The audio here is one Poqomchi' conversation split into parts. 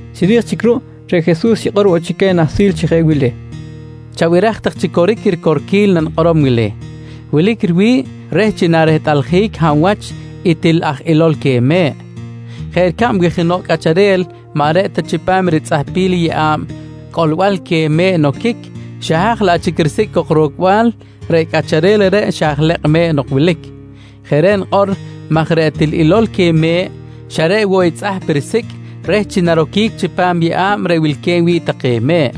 Chiri̱j chic ruꞌ, reꞌ Jesus xikꞌor woꞌ chic queh nahsil chi jeꞌ wili: «Chabiraj tak chi coric i ricorquil nanikꞌorom wili: Wilic riwi̱ꞌ reh chi narehtꞌaljic hab wach i til aj ilo̱l queh me̱ꞌ. Jeꞌ ricab wi jenoꞌ cꞌacharel maꞌ reꞌ ta chipam ritzꞌahpil i yeꞌa̱b cꞌolbal queh me̱ꞌ noquic, xa haj laꞌ chic risicꞌ cok rocbal, reꞌ cꞌacharel reꞌreꞌ xa aj lekꞌ me̱ꞌ nok wilic. Jeꞌ reꞌ nikꞌor maj reꞌ til ilo̱l queh me̱ꞌ xa reꞌ woꞌ i tzꞌahp risicꞌ reh chi naroquic chipam i yeꞌa̱b reꞌ wilque̱b wi̱ꞌ take me̱ꞌ.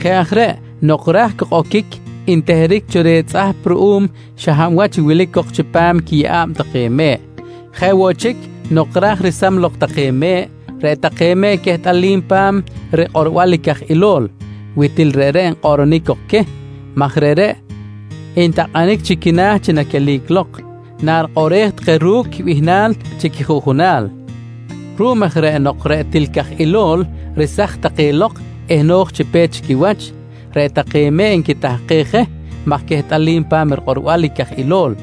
Jeꞌ aj reꞌ, nok ra̱j cok oquic nteheric cho reh i tzꞌahp ruꞌum i xa hab wach wilic cok chipam quiyeꞌa̱b take me̱ꞌ. Jeꞌ woꞌ chic nok raj resam lok take me̱ꞌ, reꞌ take me̱ꞌ quehtꞌalim pa̱m rikꞌorbal i caj ilo̱l wi til reꞌreꞌ nkꞌoꞌronic cok queh maj reꞌreꞌ ntakꞌanic chi quina̱ chi naquelic lok, narikꞌoꞌrej take ru̱cꞌ quibihnal chi quijuꞌjunal. Ruꞌum aj reꞌ nok reꞌ til caj ilo̱l resaj take lok eh no̱j chi pe̱t chi quiwach, reꞌ take me̱ꞌ nquitahkej je maj quehtꞌalim pa̱m rikꞌorbal i caj ilo̱l.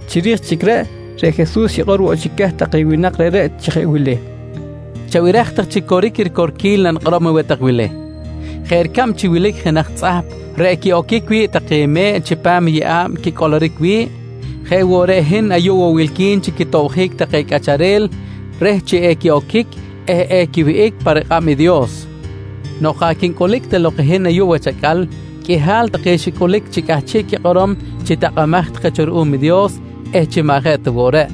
Chiri̱j chic reꞌ, reꞌ Jesus xikꞌor woꞌ chic queh take winak reꞌreꞌ chi jeꞌ wili: «Chabiraj tak chi coric i ricorquil nanikꞌorom aweh tak wili: Jeꞌ ricab chi wilic jenaj tzꞌahp reꞌ quiꞌoquic wi̱ꞌ take me̱ꞌ chipam i yeꞌa̱b quicꞌoloric wi̱ꞌ, jeꞌ woꞌ reꞌ i hin ayuꞌ woꞌ wilqui̱n chi quitobjic take cꞌacharel reh chi equiꞌoquic eh equiwihꞌic pa rikꞌab i Dios. Nok jaꞌ quincꞌulic ta lok hin ayuꞌ wach acꞌal, qꞌuihal take xicꞌulic chi cꞌahchiꞌ quikꞌorom chi takꞌamaj take cho ruꞌum i Dios eh chi maꞌ je ta woꞌ reꞌ.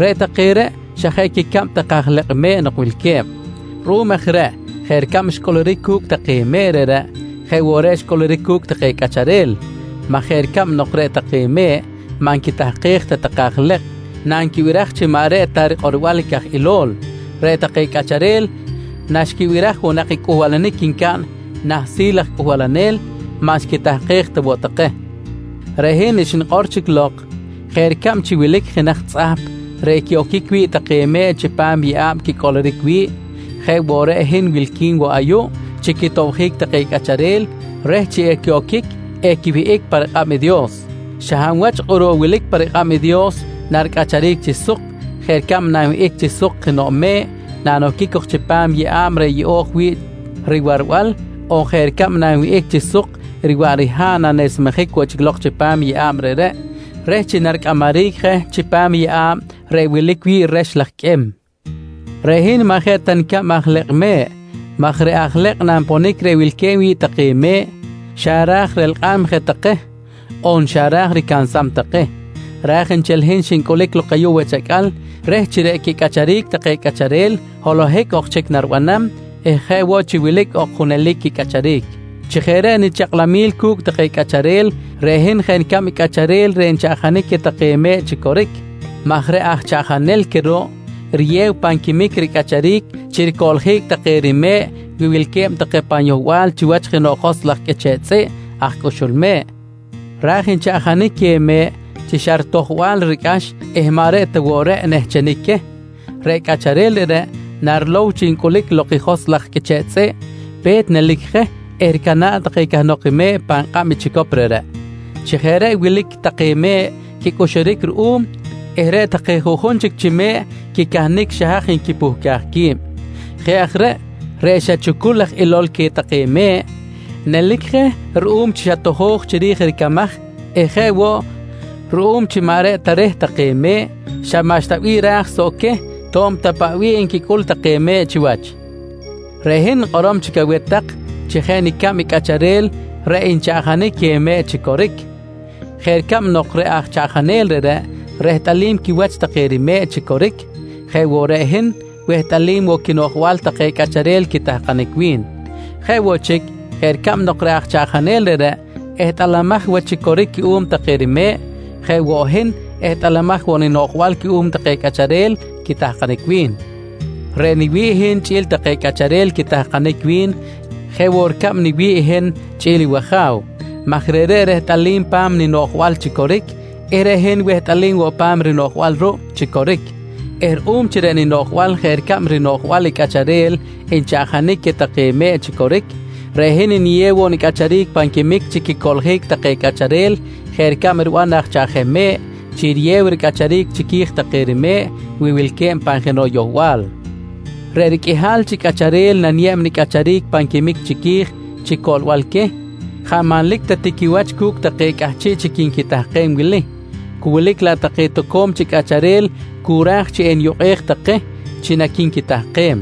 Reꞌ take reꞌ xa je quicab aj lekꞌ me̱ꞌ nok wilque̱b. Ruꞌum aj reꞌ jeꞌ ricab xcꞌuluric cu̱cꞌ take me̱ꞌ reꞌreꞌ jeꞌ woꞌ reꞌ xcꞌuluric cu̱cꞌ take cꞌacharel maj jeꞌ ricab nok reꞌ take me̱ꞌ maꞌ nquitahkej ta take aj lekꞌ nanquibiraj chi maꞌ reꞌ ta rikꞌorbal i caj ilo̱l, reꞌ take cꞌacharel naxquibiraj woꞌ nak i cꞌuhbalanic ncaꞌn nahsil aj cꞌuhbalanel, maꞌ xquitahkej ta woꞌ take. «Reꞌ hin xnikꞌor chic lok, jeꞌ ricab chi wilic jenaj tzꞌahp reꞌ quiꞌoquic wi̱ꞌ take me̱ꞌ chipam i yeꞌa̱b quicꞌoloric wi̱ꞌ jeꞌ woꞌ reꞌ i hin wilqui̱n woꞌ ayuꞌ chi quitobjic take cꞌacharel reh chi equiꞌoquic eh equiwihꞌic pa rikꞌab i Dios. Xa hab wach kꞌuruꞌ wilic pa rikꞌab i Dios naricꞌacharic chi suk jeꞌ ricab nanwihꞌic chi suk jenoꞌ me̱ꞌ nanoquic cok chipam i yeꞌa̱b reꞌ yeꞌo̱j wi̱ꞌ riwarbal on jeꞌ ricab nanwihꞌic chi suk riwaꞌ riha̱ꞌ nanesmejic woꞌ chic lok chipam i yeꞌa̱b reꞌreꞌ reh chi naricꞌamaric je chipam i yeꞌa̱b reꞌ wilic wi̱ꞌ rex laj qꞌuim. Reꞌ hin maꞌ je ta nicab aj lekꞌ me̱ꞌ maj reꞌ aj lekꞌ nanponic reꞌ wilque̱b wi̱ꞌ take me̱ꞌ, xa ra̱j relkꞌam je take on xa ra̱j ricansam take. Raj nchel i hin xincꞌulic ayuꞌ wach acꞌal reh chi reꞌ quicꞌacharic take cꞌacharel holohic ok chic naribanam eh jeꞌ woꞌ chi wilic ok junelic quicꞌacharic. Chi jeꞌ reꞌ nichakꞌlamil cu̱cꞌ take cꞌacharel, reꞌ hin jeꞌ nicab i cꞌacharel reꞌ nchaꞌjanic queh take me̱ꞌ chi coric maj reꞌ aj chaꞌjanel queh ruꞌ, riyew pan quimic ricꞌacharic chi ricoꞌljic take rime̱ꞌ wi wilque̱b take pan yohbal chiwach jenoꞌ joskꞌ laj qꞌuiche̱ꞌ tzꞌiꞌ aj cꞌuxul me̱ꞌ, ra̱j nchaꞌjanic queh me̱ꞌ chi xa ritojbal ricꞌax eh maꞌ reꞌ ta woꞌ reꞌ nehchenic queh, reꞌ cꞌacharel reꞌreꞌ narilow chi ncꞌulic lok i joskꞌ laj qꞌuiche̱ꞌ tzꞌiꞌ, pe̱t nelic je eh ricana̱ꞌ cahnok take me̱ꞌ pan kꞌab i chicop reꞌreꞌ. Chi jeꞌ reꞌ wilic take me̱ꞌ quicꞌuxuric ruꞌum eh reꞌ take juꞌjun chic chi me̱ꞌ quicahnic xa haj nquipuhcaj qui̱b. Jeꞌ aj reꞌ, reꞌ xa chucul aj ilo̱l queh take me̱ꞌ, nelic je ruꞌum chi xa tojo̱j chiri̱j i ricamaj eh jeꞌ woꞌ ruꞌum chi maꞌ reꞌ ta reh take me̱ꞌ, xa maꞌxta bih raj soꞌ queh to̱b ta paꞌ bih nquicꞌul take me̱ꞌ chiwach. Reꞌ hin nikꞌorom chic aweh tak chi jeꞌ nicab i cꞌacharel reꞌ nchaꞌjanic queh me̱ꞌ chi coric. Jeꞌ ricab nok reꞌ aj chaꞌjanel reꞌreꞌ rehtꞌalim quiwach take rime̱ꞌ chi coric jeꞌ woꞌ reꞌ hin wehtꞌalim woꞌ quinoꞌjbal take cꞌacharel quitahkanic wi̱n. Jeꞌ woꞌ chic jeꞌ ricab nok reꞌ aj chaꞌjanel reꞌreꞌ ehtꞌalamaj wach chi coric cuꞌum take rime̱ꞌ, jeꞌ woꞌ hin ehtꞌalamaj woꞌ ninoꞌjbal cuꞌum take cꞌacharel quitahkanic wi̱n. «Reꞌ niwi̱ꞌ i hin chꞌi̱l take cꞌacharel quitahkanic wi̱n jeꞌ woꞌ ricab niwi̱ꞌ i hin chꞌi̱l i wAja̱w maj reꞌreꞌ rehtꞌalim pa̱m ninoꞌjbal chi coric eh reꞌ hin wehtꞌalim woꞌ pa̱m rinoꞌjbal ruꞌ chi coric eh ruꞌum chi reꞌ ninoꞌjbal jeꞌ ricab i rinoꞌjbal i cꞌacharel nchaꞌjanic queh take me̱ꞌ chi coric, reꞌ hin niyew woꞌ nicꞌacharic pan quimic chi quicoꞌljic take cꞌacharel jeꞌ ricab riban aj chaꞌjem chi riyew ricꞌacharic chiqui̱j take rime̱ꞌ wi wilque̱b pan jenoꞌ yohbal. Reꞌ riqꞌuihal chi cꞌacharel naniyeb nicꞌacharic pan quimic chiqui̱j chi coꞌlbal queh, jaꞌ manlic ta ti quiwach cu̱cꞌ take cꞌahchiꞌ chic quinquitahkem wili, cu wilic laꞌ take toco̱m chic cꞌacharel cu ra̱j chi eniyukꞌej take chi naqui̱nquitahkem.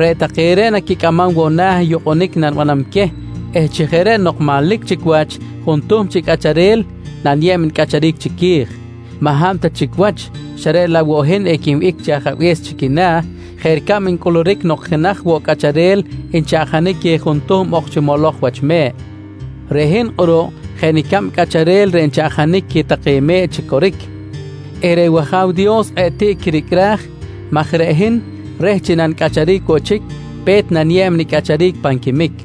Reꞌ take reꞌ naquicꞌamam woꞌ na̱ i yukꞌunic nanibanam queh eh chi jeꞌ reꞌ nok manlic chic wach i juntuhm chi cꞌacharel naniyeb nicꞌacharic chiqui̱j, maꞌ hab ta chic wach xa reꞌ laꞌ woꞌ hin equinwihꞌic chi Ajabe̱s chi quina̱ jeꞌ ricab ncꞌuluric nok jenaj woꞌ cꞌacharel nchaꞌjanic queh juntuhm ok chi moloj wach me̱ꞌ. «Reꞌ hin kꞌuruꞌ jeꞌ nicab i cꞌacharel reꞌ nchaꞌjanic queh take me̱ꞌ chi coric eh reꞌ wAja̱w Dios kꞌe̱ꞌ tiꞌ quiricꞌraj maj reꞌ hin reh chi nanicꞌacharic woꞌ chic, pe̱t naniyeb nicꞌacharic pan quimic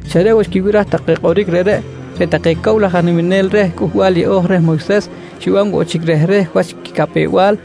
Xa reꞌ woꞌ xquibiraj take kꞌoric reꞌreꞌ, reꞌ take cow laj aj niminel reh Cꞌuhbal Yeꞌo̱j reh Moyses xiban woꞌ chic rehreh wach quicapew-bal.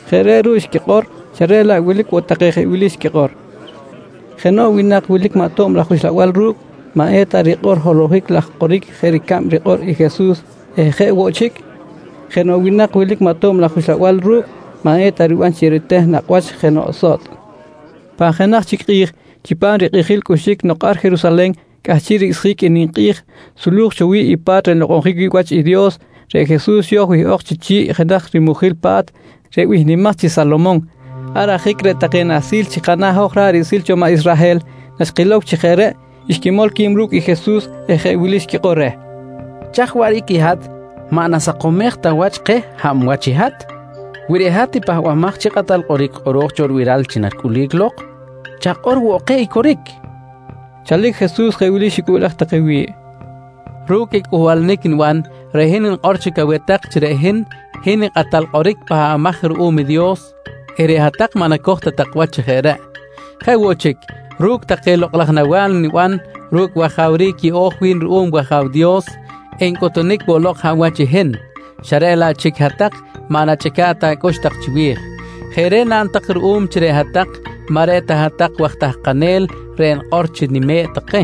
Jeꞌ reꞌ ruꞌ xquikꞌor xa reꞌ laꞌ wilic woꞌ take jeꞌ wili nquikꞌor: «Jenoꞌ winak wilic maꞌ tob laj uxlabal ru̱cꞌ maꞌ eta rikꞌor holohic laj kꞌoric jeꞌ ricab rikꞌor i Jesus eh jeꞌ woꞌ chic, jenoꞌ winak wilic maꞌ tob laj uxlabal ru̱cꞌ maꞌ eta riban chi eriteh nakꞌ wach jenoꞌ sotꞌ, nqui take. Pan jenaj chic kꞌi̱j chipam rikꞌijil cꞌuxic nok ar Jerusalen cꞌahchiꞌ ricꞌsjic i ninkꞌi̱j sulu̱j cho wi̱ꞌ i Lokꞌ laj Pa̱t reꞌ nlokꞌonjic wi̱ꞌ wach i Dios reꞌ Jesus xo̱j wihꞌok chi chi̱ꞌ jenaj rimujil pa̱t reꞌ bihnimaj chi Salomon. Ar ajic reꞌ take nahsil chi kana̱ hoj ra̱ꞌ riꞌsil cho maꞌ Israhel naxquilow chi jeꞌ reꞌ, xquimol qui̱b ru̱cꞌ i Jesus eh jeꞌ wili xquikꞌor reh: «Chaj waꞌric i hat maꞌ nasakomej ta wach keh hab wach i hat? Wi reꞌ hat i Pahbamaj chi Kꞌatal Kꞌoric kꞌoro̱j cho ribiral chi naricꞌulic lok, chakꞌor woꞌ keh i coric, nqui take reh. Chalic Jesus jeꞌ wili xicꞌuꞌlej take wi̱ꞌ: «Ru̱cꞌ i cꞌuhbalanic niban reꞌ hin nikꞌor chic aweh tak chi reꞌ hin, hin i Kꞌatal Kꞌoric Pahbamaj cho ruꞌum i Dios eh reꞌ hat-tak maꞌ nacoj ta tak wach chi jeꞌ reꞌ. Jeꞌ woꞌ chic, ru̱cꞌ take lokꞌ laj nawa̱l niban ru̱cꞌ i wajawric yeꞌo̱j wi̱n ruꞌum i wAja̱w Dios, ncꞌutunic woꞌ lok hab wach i hin xa reꞌ laꞌ chic hat-tak maꞌ nachꞌica̱ꞌ ta acꞌux tak chiwi̱j. Jeꞌ reꞌ naꞌn tak ruꞌum chi reꞌ hat-tak maꞌ reꞌ ta hat-tak waj tahkanel reꞌ nikꞌor chi nime̱ꞌ take.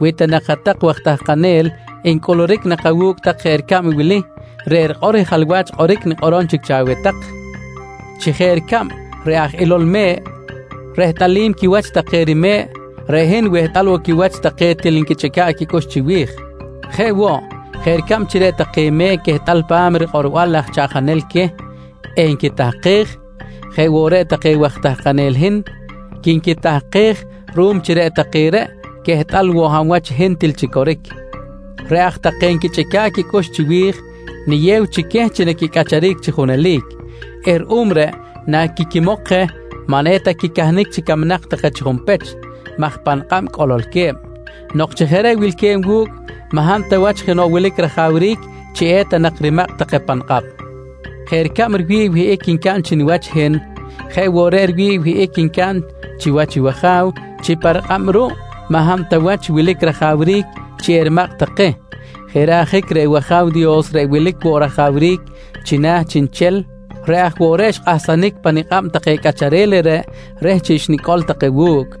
Wi ta nak hat-tak waj tahkanel, ncꞌuluric nak awu̱cꞌ tak jeꞌ ricab i wili reꞌ rikꞌor i jalwach kꞌoric nikꞌorom chic cho aweh tak: Chi jeꞌ ricab reꞌ aj ilo̱l me̱ꞌ rehtꞌalim quiwach take rime̱ꞌ reꞌ hin wehtꞌal woꞌ quiwach take til nquichꞌica̱ꞌ quicꞌux chiwi̱j. Jeꞌ woꞌ, jeꞌ ricab chi reꞌ take me̱ꞌ quehtꞌal pa̱m rikꞌorbal i aj chaꞌjanel queh eh nquitahkej, jeꞌ woꞌ reꞌ take waj tahkanel i hin, quinquitahkej ruꞌum chi reꞌ take reꞌ quehtꞌal woꞌ hab wach i hin til chi coric. Reꞌ aj take nquichꞌica̱ꞌ quicꞌux chiwi̱j, niyew chic queh chi naquicꞌacharic chi junelic eh ruꞌum reꞌ, naquiquimok je maꞌ eta quicahnic chi camnak take chi junpech maj pa nikꞌab cꞌololque̱b. Nok chi jeꞌ reꞌ wilque̱b wu̱cꞌ, maꞌ hab ta wach jenoꞌ wilic rajawric chi eta nak rimakꞌ take pa nikꞌab. Jeꞌ ricab riwi̱ꞌ i wihꞌic ncaꞌn chi niwach i hin jeꞌ woꞌ reꞌ riwi̱ꞌ i wihꞌic ncaꞌn chiwach i wAja̱w chi pa rikꞌab ruꞌ maꞌ hab ta wach wilic rajawric chi erimakꞌ take. Jeꞌ reꞌ ajic reꞌ wAja̱w Dios reꞌ wilic woꞌ rajawric chi nah chiꞌnchel reꞌ aj woꞌ reꞌ xkꞌahsanic pa nikꞌab take cꞌacharel reꞌreꞌ reh chi xnicꞌol take wu̱cꞌ.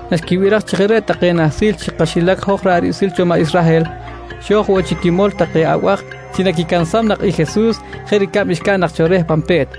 Naxquibiraj chi jeꞌ reꞌ take nahsil chi kaxilac hoj ra̱ꞌ riꞌsil cho maꞌ Israhel, xo̱j woꞌ chic quimolom take abaj chi naquicansam nak i Jesus jeꞌ ricab xcaꞌn nak cho reh pan pe̱t,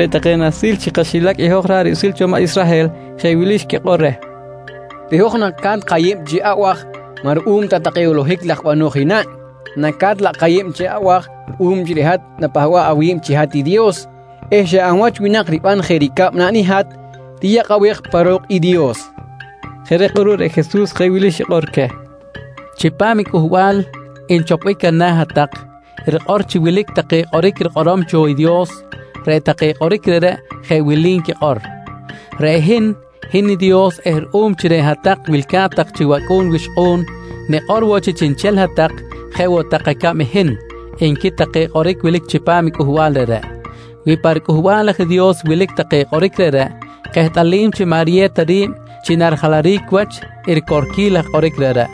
Reꞌ take nahsil chi kaxilac i hoj ra̱ꞌ riꞌsil cho maꞌ Israhel jeꞌ wili xquikꞌor reh: «Reꞌ hoj naca̱t kayeb chi abaj maꞌ ruꞌum ta take holohic laj bano̱j i naꞌn, naca̱t laꞌ kayeb chi abaj ruꞌum chi reꞌ hat napahba̱ꞌ awi̱b chi hat Dios eh xa hab wach winak riban jeꞌ ricab naꞌn i hat riyakꞌabej pa ro̱k i Dios, nqui take reh. Jeꞌ reꞌ kꞌuruꞌ reꞌ Jesus jeꞌ wili xikꞌor queh: «Chipam i cꞌuhbal nchopbic ana̱ hat-tak, rikꞌor chi wilic take kꞌoric rikꞌorom cho i Dios. Reꞌ take kꞌoric reꞌreꞌ jeꞌ wili nquikꞌor: “Reꞌ hin, hin i Dios eh ruꞌum chi reꞌ hat-tak wilca̱t tak chi wacꞌu̱n wixkꞌu̱n, nikꞌor woꞌ chi chiꞌnchel hat-tak jeꞌ woꞌ tak acab i hin, nqui take kꞌoric wilic chipam i cꞌuhbal reꞌreꞌ. «Wi pa riCꞌuhbal aj i Dios wilic take kꞌoric reꞌreꞌ, kehtꞌalim chi maꞌ riyew ta ri̱b chi narijalaric wach i ricorquil laj kꞌoric reꞌreꞌ.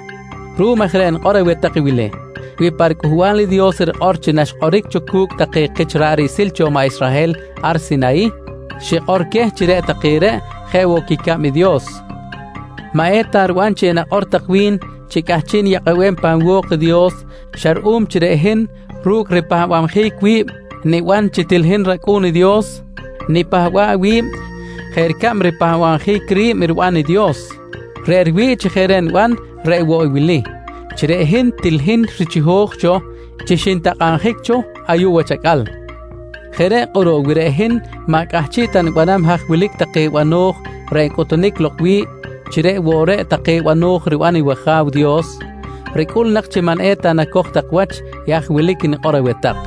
Ruꞌum aj reꞌ nikꞌor aweh tak wili: ‹Wi pa riCꞌuhbal i Dios rikꞌor chi naxkꞌoric cho cu̱cꞌ take kich ra̱ꞌ riꞌsil cho maꞌ Israhel ar Sinayih, xikꞌor queh chi reꞌ take reꞌ jeꞌ woꞌ quicab i Dios, maꞌ eta riban chi enakꞌor tak wi̱n chi cꞌahchiꞌ niyakꞌabem pan wo̱k i Dios xa ruꞌum chi reꞌ hin ru̱cꞌ i nipahbabjic wi̱b niban chi til hin rAcꞌu̱n i Dios nipahba̱ꞌ wi̱b jeꞌ ricab ripahba̱bjic ri̱b riban i Dios. Reꞌ riwi̱ꞌ chi jeꞌ reꞌ niban reꞌ woꞌ i wili: Chi reꞌ hin til hin richiho̱j cho chi xintakꞌabjic cho ayuꞌ wach acꞌal. Jeꞌ reꞌ kꞌuruꞌ wi reꞌ hin maꞌ cꞌahchiꞌ ta nibanam haj wilic take bano̱j reꞌ ncꞌuhtunic lok wi̱ꞌ chi reꞌ woꞌ reꞌ take bano̱j riban i wAja̱w Dios, ricꞌul nak chi maꞌ eta nacoj tak wach i haj wilic nikꞌor aweh tak.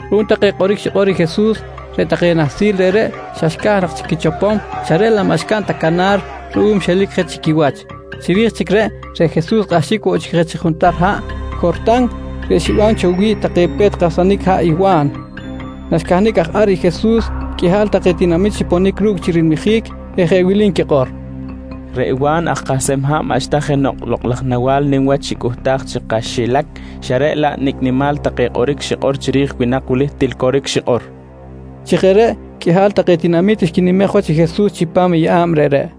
Ruꞌum take kꞌoric xikꞌor i Jesus, reꞌ take nahsil reꞌreꞌ xa xca̱j nak chic quichopom xa reꞌ laꞌ maꞌ xcaꞌn ta canar ruꞌum xelic je chi quiwach. Chiri̱j chic reꞌ, reꞌ Jesus kꞌahxic woꞌ chic je chi juntar haꞌ Jortan reꞌ xiban cho wi̱ꞌ take pe̱t kahsanic haꞌ i Wa̱n. Naxcahnic aj ar i Jesus, qꞌuihal take tinamit xiponic ru̱cꞌ chi rilmijic eh jeꞌ wili nquikꞌor: «Reꞌ Wa̱n aj kahsem haꞌ maꞌxta jenoꞌ lokꞌ laj nawa̱l nim wach xicꞌuhtaj chi kaxilac, xa reꞌ laꞌ nicꞌ nimal take kꞌoric xikꞌor chiri̱j i winak wili, til coric xikꞌor, nqui take. Chi jeꞌ reꞌ qꞌuihal take tinamit xquinimej i Jesus chipam i yeꞌa̱b reꞌreꞌ.